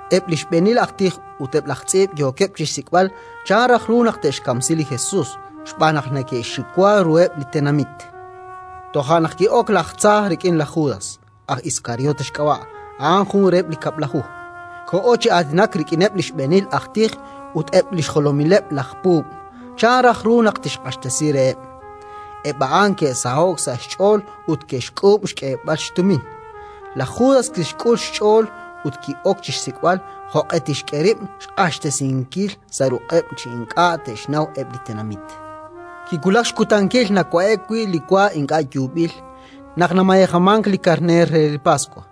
Eb' li xb'eenil aj tij ut eb' laj tz'iib' yookeb' chi xsik'b'al chan raj ru naq te'xkamsi li Jesus xb'aan naq neke'xxiwa ruheb' li tenamit. Toja' naq ki'ok laj tza rik'in laj Judas, aj Iskariote xk'ab'a', a'an jun reheb' li Kab'laju. Koho chi aatinak rik'ineb' li xb'eenil aj tij ut eb' li xjolomileb' laj puub', chan raj ru naq tixq'axtesi reheb'. Eb' a'an ke'saho'k sa' xch'ool ut ke'xk'uub' xk'eeb'al xtumin. Laj Judas kixk'ul xch'ool ut ki'ok chi xsik'b'al jo'q'e tixk'e rib' xq'axtesinkil sa' ruq'eb' chi ink'a' te'xnaw eb' li tenamit. Kiwulak xkutankil nawa'e'k wi' li wa ink'a' yuub'il, naq namayejamank li karneer re li Paswa.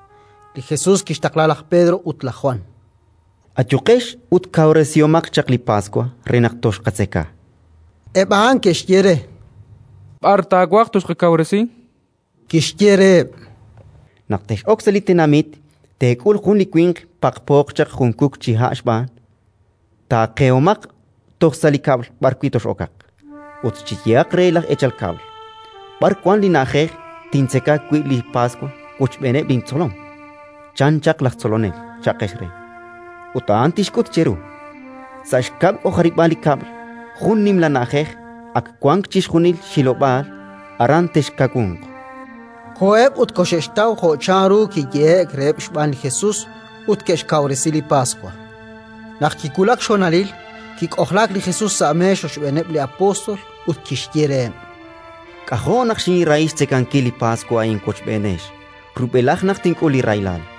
Li Jesus kixtaqla laj Pedro ut laj Jwan: —Ayuqex ut kawresihomaq chaq li Paswa re naq toxqatzeka, chan reheb'. Eb' a'an ke'xye re: —B'ar taawaj toxqakawresi? Kixye reheb': —Naq tex'ok sa' li tenamit, teek'ul jun li winq paqpooq chaq jun kuk chi ha' xb'aan. Taaqehomaq toj sa' li kab'l b'arwi' tox'okaq, ut cheyehaq re laj eechal kab'l: «B'ar wank li na'ajej tintzeka wi' li Paswa wochb'eeneb' lintzolom? chan chaq laj Tzolonel», cha'qex re. Ut a'an tixk'ut cheru, sa' xkab' xk'ojaril li kab'l, jun nimla na'ajej, ak wank chixjunil xhilob'aal. Aran texkawunq. Koheb' ut koxe'xtaw jo' chanru kiyehe'k reheb' xb'aan li Jesus, ut ke'xkawresi li Paswa. Naq kiwulak xhonalil, kik'ojlaak li Jesus sa' meex rochb'eeneb' li apóstol ut kixye reheb': —K'ajo' naq xinrahi xtzekankil li Paswa a'in wochb'eenex, rub'elaj naq tink'ul li rahilal!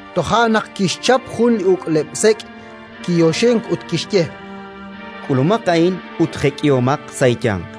Toja' naq kixchap jun li uk'leb'-sek', kiyoxink ut kixye: —K'ulumaq a'in ut jek'ihomaq sa' eeyanq,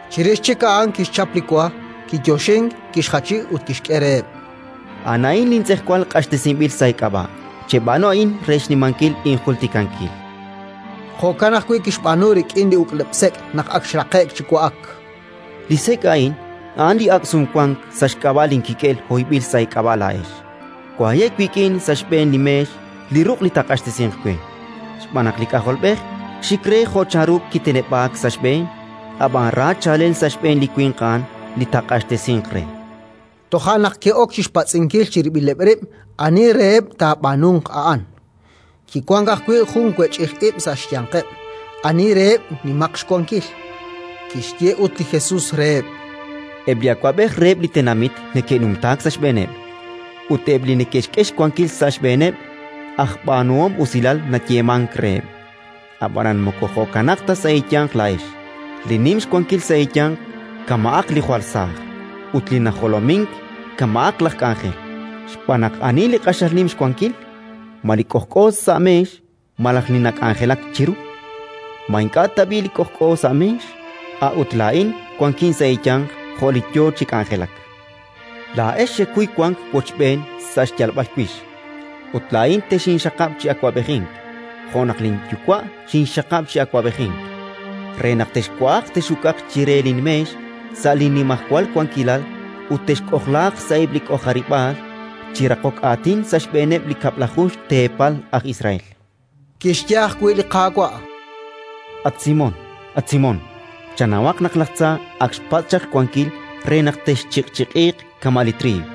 Chirix chik a'an kixchap li wa, kiyoxink, kixjachi ut kixk'e reheb': —A'an a'in lintz'ejwal q'axtesinb'il sa' eek'ab'a'. Cheb'aanu a'in re xnimankil injultikankil. Jo'kan ajwi' kixb'aanu rik'in li uk'leb'-sek', naq ak xraqe'k chi wa'ak: —Li sek' a'in a'an li Ak' Sumwank sa' xk'ab'a' linkik'el hoyb'il sa' eek'ab'a' laa'ex. Waye' wik'in sa' xb'een li meex li ruq' li taaq'axtesinq we. Xb'aan naq li K'ajolb'ej xik re jo' chanru kiteneb'aak sa' xb'een, ab'an ra chaalel sa' xb'een li winq a'an li taaq'axtesinq re! Toja' naq ke'ok chi xpatz'inkil chirib'ileb' rib' ani reheb' li taab'aanunq a'an. Kiwank ajwi' jun wech'ij ib' sa' xyanqeb', ani reheb' nimaq xwankil. Kixye ut li Jesus reheb': “Eb' li awab'ej reheb' li tenamit neke'numtaak sa' xb'eeneb'; ut eb' li neke'xk'e xwankil sa' xb'eeneb', aj b'aanuhom usilal nayeemank reheb'. Ab'anan moko jo'kanaq ta sa' eeyanq laa'ex: li nim xwankil sa' eeyanq kama'aq li jwal saaj, ut li najolomink kama'aq laj k'anjel. Xb'aan naq ani li q'axal nim xwankil? Ma li k'ojk'o sa' meex malaj li nak'anjelak chiru? Ma ink'a' tab'i' li k'ojk'o sa' meex? A'ut laa'in wankin sa' eeyanq jo' li yo chi k'anjelak. “Laa'ex xekuy wank wochb'een sa' li xyalb'al wix: ut laa'in texinxaqab' chi awab'ejink, jo' naq linYuwa' xinxxaqab' chi awab'ejink, re naq texwa'aq tex'uk'aq chire linmeex sa' linnimajwal wankilal ut texk'ojlaaq sa'eb' li k'ojarib'aal chi raqok aatin sa' xb'eeneb' li kab'laju xteepal aj Israel”. Kixye ajwi' li Qaawa': —At Simón, at Simón! Chanawaq naq laj tza ak xpatz' chaq xwankil re naq texchiq'chiq'iiq kama' li triiw.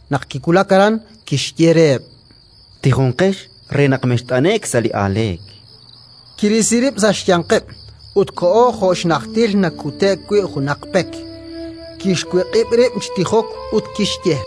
Naq kiwulak aran, kixye reheb': —Tijonqex re naq mext'ane'k sa' li aaleek. Kirisi rib' sa' xyanqeb' ut koho jo' xnajtil nakute'k wi' junaq pek; kixwiq'ib' rib' chi tijok ut kixye: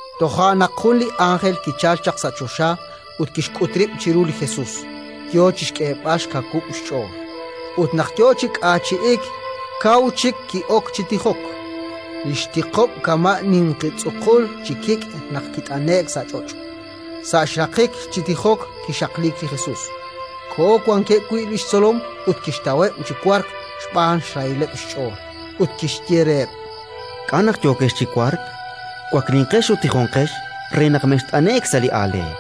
Toja' naq jun li ánjel kichalk chaq sa' choxa ut kixk'ut rib' chiru li Jesus, yo chi xk'eeb'al xkawub' xch'ool. Ut naq yo chi k'aachi'ik, kaw chik ki'ok chi tijok: li xtiqob' kama' ninqi tz'uqul chi kik' naq kit'ane'k sa' ch'och'. Sa' xraqik chi tijok kixaqliik li Jesus, koho wankeb' wi' li xtzolom ut kixtaweb' chi wark xb'aan xrahilaleb' xch'ool; ut kixye reheb': —K'a' naq yookex chi wark? Waklinqex ut tijonqex re naq mext'ane'k sa' li aaleek.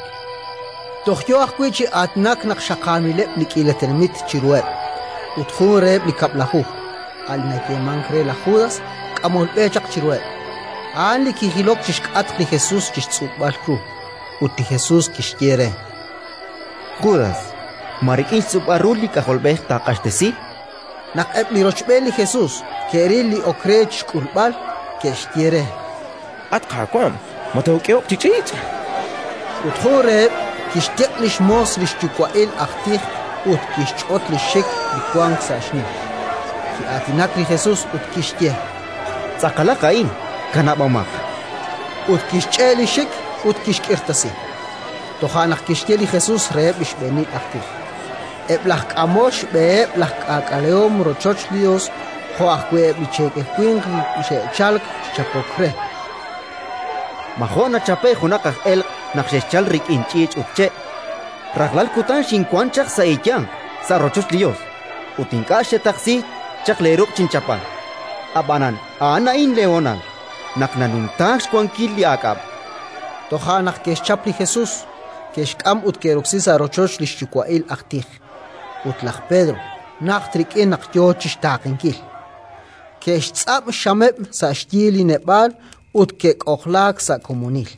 Toj yo ajwi' chi aatinak naq xaqaamileb' li k'iila tenamit chiruheb', ut jun reheb' li Kab'laju, a' li nayeemank re laj Judas, k'amol b'e chaq chiruheb'. A'an kijilok chi xk'atq li Jesus chi xtz'ub'al ru. Ut li Jesus kixye re: —Judas, ma rik'in xtz'ub'al ru li K'ajolb'ej taaq'axtesi? Naq eb' li rochb'een li Jesus ke'ril li ok re chi xk'ulb'al, ke'xye re: —At Qaawa', ma took'ehoq chi ch'iich'? Ut jun reheb' kixtiq' li xmoos li xyuwa'il aj tij ut kixch'ot li xxik li wank sa' xnim. Ki'aatinak li Jesus ut kixye: —Tz'aqalaq a'in, kanab'omaq! Ut kixch'e' li xxik ut kixk'irtasi. Toja' naq kixye li Jesus reheb' li xb'eenil aj tij, eb' laj k'amol xb'eheb' laj k'aak'alehom rochoch li Yos jo' ajwi' eb' li cheekel winq li xe'chalk chi chapok re: —Ma jo' nachape'k junaq aj elq' naq xexchalk rik'in ch'iich' ut che'? Rajlal kutan xinwank chaq sa' eeyanq sa' rochoch li Yos, ut ink'a' xetaqsi chaq leeruq' chinchapb'al; ab'anan a'an a'in leehonal, naq nanumtaak xwankil li aak'ab'. Toja' naq ke'xchap li Jesus, ke'xk'am ut ke'roksi sa' rochoch li xyuwa'il aj tij, ut laj Pedro najt rik'in naq yo chi xtaaqenkil. Ke'xtz'ab' xxameb' sa' xyi li neb'aal ut ke'k'ojlaak sa' komonil;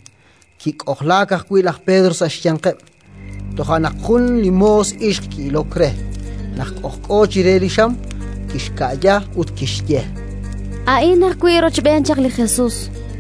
kik'ojlaak ajwi' laj Pedro sa' xyanqeb'. Toja' naq jun li moos ixq ki'ilok re, naq k'ojk'o chire li xam; kixka'ya ut kixye: —A'in ajwi' rochb'een chaq li Jesus.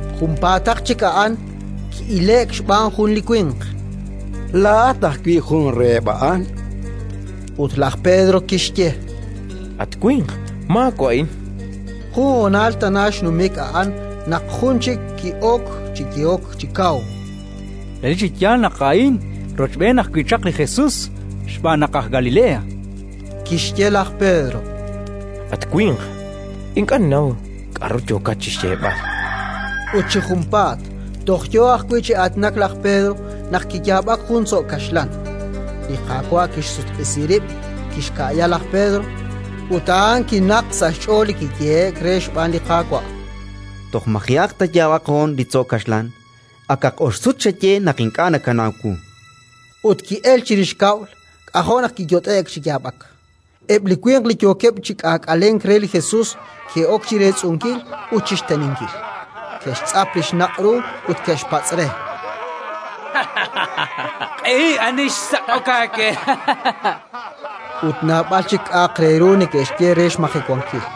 Junpaataq chik a'an, ki'ile'k xb'aan jun li winq: —Laa'at ajwi' jun reheb' a'an, chu'uxk re. Ut laj Pedro kixye: —At winq, maawa'in! Jun honal tana xnumik a'an naq jun chik ki'ok chi yehok chi kaw: —Relik chi yaal naq a'in rochb'een ajwi' chaq li Jesus, xb'aan naq aj Galilea. Kixye laj Pedro: —At winq, ink'a' ninnaw k'aru yookat chi xyeeb'al. Ut chi junpaat, toj yo ajwi' chi aatinak laj Pedro, naq kiyaab'ak jun li tzo' kaxlan. Li Qaawa' kixsutq'isi rib', kixka'ya laj Pedro, ut a'an kinaqk sa' xch'ool li kiyehe'k re xb'aan li Qaawa': “Toj maji'aq taayaab'aq hoon li tzo' kaxlan, akaq ox sut xaye naq ink'a' nakanaw wu”. Ut ki'elk chirix kab'l: k'ajo' naq kiyot'e'k chi yaab'ak. Eb' li winq li yookeb' chi k'aak'alenk re li Jesus ke'ok chi reetz'unkil ut chi xteninkil; ke'xtz'ap li xnaq' ru ut ke'xpatz' re: —Q'ehi: ani xsak'ok aawe? Ut naab'al chik k'a'aq re ru neke'xye re xmajewankil.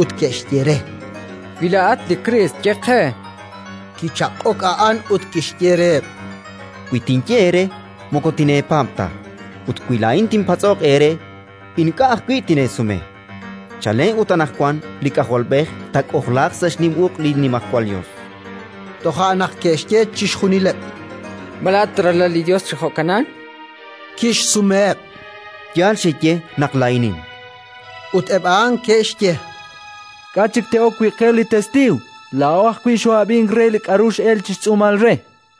ut ke'xye re: —Wi laa'at li Kriist, ye qe. Kichaq'ok a'an ut kixye reheb': —Wi tinye eere, moko tineepaab' ta; ut wi laa'in tinpatz'oq eere, ink'a' ajwi' tineesume. Chalen ut anaqwan li K'ajolb'ej taak'ojlaaq sa' xnim uq' li Nimajwal Yos. Toja' naq ke'xye chixjunileb': —Ma laa'at Ralal li Yos chi jo'kanan? Kixsumeheb': —Yaal xeye naq laa'inin, chan. Ut eb' a'an ke'xye: —K'a' chik te'ok wi' qe li testiiw? Laa'o ajwi' xoo'ab'ink re li k'aru x'elk chi xtz'uumal re.